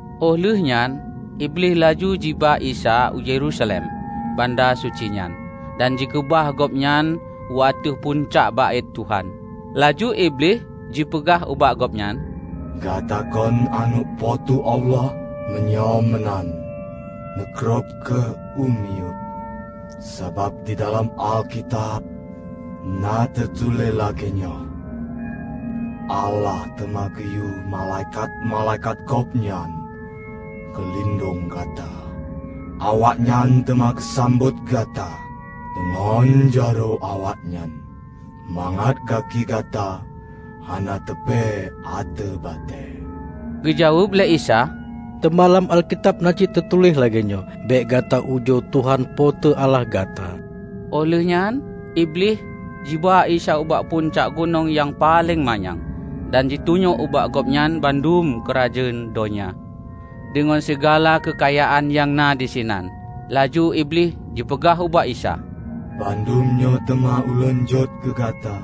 Óh lheueh nyan Iblih laju jiba Isa u Yerusalem, banda suci nyan, dan jikeubah Gobnyan u ateueh pucak Baét Tuhan. Laju Iblih jipeugah ubak Gobnyan, "Gata kon Aneuëk Po teu Allah? Meunyoe meunan, neugrob kheueh u miyueb; sabab didalam Alkitab na teutuléh lagée nyoe, 'Allah teuma geuyue malaikat-malaikat Gobnyan geulindong gata, awaknyan teuma geusambot gata deungon jaroe awaknyan, mangat gaki gata hana tupéh ateueh batée.' " Geu jaweueb lé Isa, "Teuma lam Alkitab na cit teutuléh lagée nyoe, 'Bék gata ujoe Tuhan Po teu Allah gata.' " Óh lheueh nyan Iblih jiba Isa ubak pucak gunong nyang paleng manyang dan jitunyok ubak Gobnyan bandum keurajeuen donya deungon sigala keukayaan nyang na disinan. Laju Iblih jipeugah ubak Isa, "Bandum nyoe teuma ulôn jok keu Gata,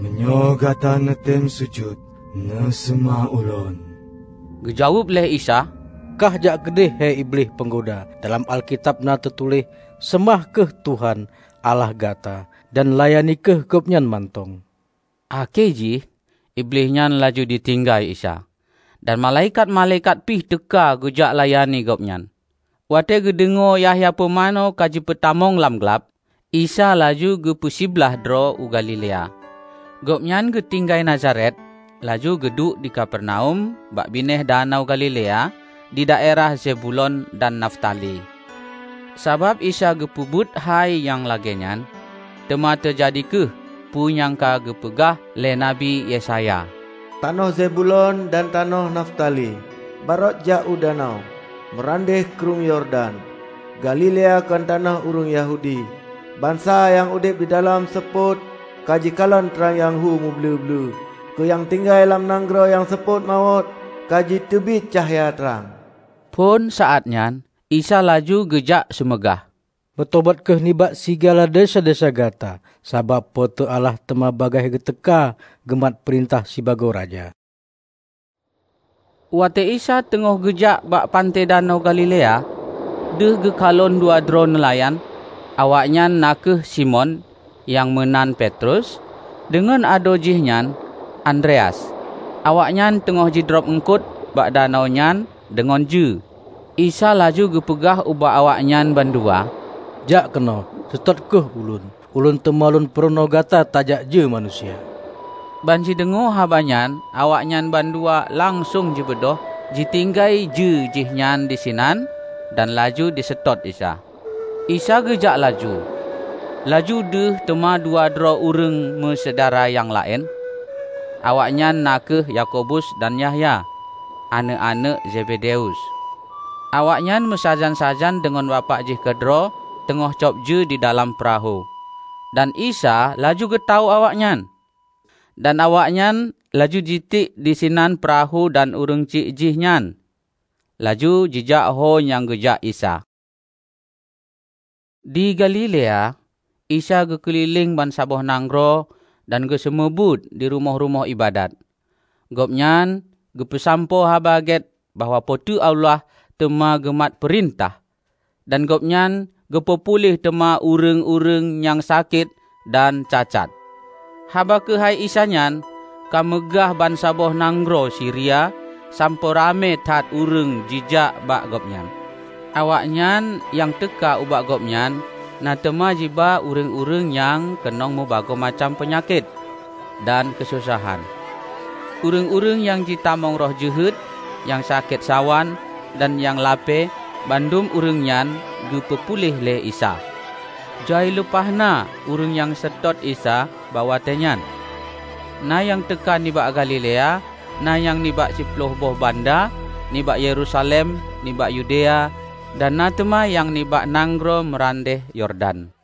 meunyoe Gata neutem sujut neuseumah ulôn." Geujaweueb lé Isa, "Kah jak keudeh, he Iblih peunggoda! Dalam Alkitab na teutuléh: Seumah kheueh Tuhan, Allah gata, dan layani kheueh Gobnyan mantong!" Akhé jih Iblih nyan laju jitinggai Isa, dan malaikat-malaikat pih teuka geujak layani Gobnyan. Watée geudeungoe Yahya pumanö ka jipeutamong lam glab, Isa laju geupeu siblaih droe u Galilea. Gobnyan geutinggai Nazaret, laju geuduek di Kapernaum bak binéh Danau Galilea di daerah Zebulon dan Naftali. Sabab Isa geupeubuet hai nyang lagée nyan, teuma teujadi kheueh peue nyang ka geupeugah lé Nabi Yesaya: "Tanoh Zebulon dan tanoh Naftali, bak rot jak u danau, meurandeh Krueng Yordan, Galilea kon tanoh ureuëng Yahudi! Bansa nyang udeb didalam seupôt ka jikalon trang nyang hu muble-ble! Keu nyang tinggai lam nanggroe nyang seupôt mawöt ka jiteubiet cahya trang!" Phon saát nyan Isa laju geujak seumeugah, "Meutobat kheueh nibak sigala desya-desya gata, sabab Po teu Allah teuma bagaih geuteuka geumat peurintah sibagoe Raja!" Watée Isa teungoh geujak bak panté Danau Galilea, deuh geukalon dua droe neulayan, awaknyan na kheueh Simon (Nyang meunan Petrus) deungon adoe jihnyan, Andreas. Awaknyan teungoh jidrob uengkot bak danau nyan deungon jeue. Isa laju geupeugah ubak awaknyan bandua, "Jak keunoe, seutôt kheueh Ulôn. Ulôn teuma Lôn peurunoe gata tajak jeue manusia." Ban jideungoe haba nyan awaknyan bandua langsong jibeudôh jitinggai jeue jihnyan disinan dan laju jiseutôt Isa. Isa geujak laju, laju deuh teuma dua droe ureuëng meusyedara nyang laén, awaknyan na kheueh Yakobus dan Yahya, aneuëk-aneuëk Zebedeus, awaknyan meusajan-sajan deungon bapak jih keudroe teungoh cob jeue didalam peurahô. Dan Isa laju geutawök awaknyan, dan awaknyan laju jitiek disinan peurahô dan ureuëng syiek jihnyan, laju jijak ho nyang geujak Isa. Di Galilea, Isa geukeulileng bansaboh nanggroe dan geuseumeubeuet di rumoh-rumoh iébadat. Gobnyan geupeusampoe Haba Gét bahwa Po teu Allah teuma geumat peurintah. Dan Gobnyan geupeu puléh teuma ureuëng-ureuëng nyang sakét dan cacat. Haba keuhai Isa nyan ka meugah bansaboh nanggroe Siria, sampoe ramé that ureuëng jijak bak Gobnyan. Awaknyan nyang teuka ubak Gobnyan na teuma jiba ureuëng-ureuëng nyang keunong meubagoe macam peunyakét dan keusosahan. Ureuëng-ureuëng nyang jitamong roh jeuhet, nyang sakét sawan, dan nyang lapée, bandum ureuëng nyan geupeu puléh lé Isa. Jai lumpah na ureuëng nyang seutôt Isa bak watée nyan. Na nyang teuka nibak Galilea, na nyang nibak siploh boh banda, nibak Yerusalem, nibak Yudea, dan na teuma nyang nibak nanggroe meurandeh Yordan.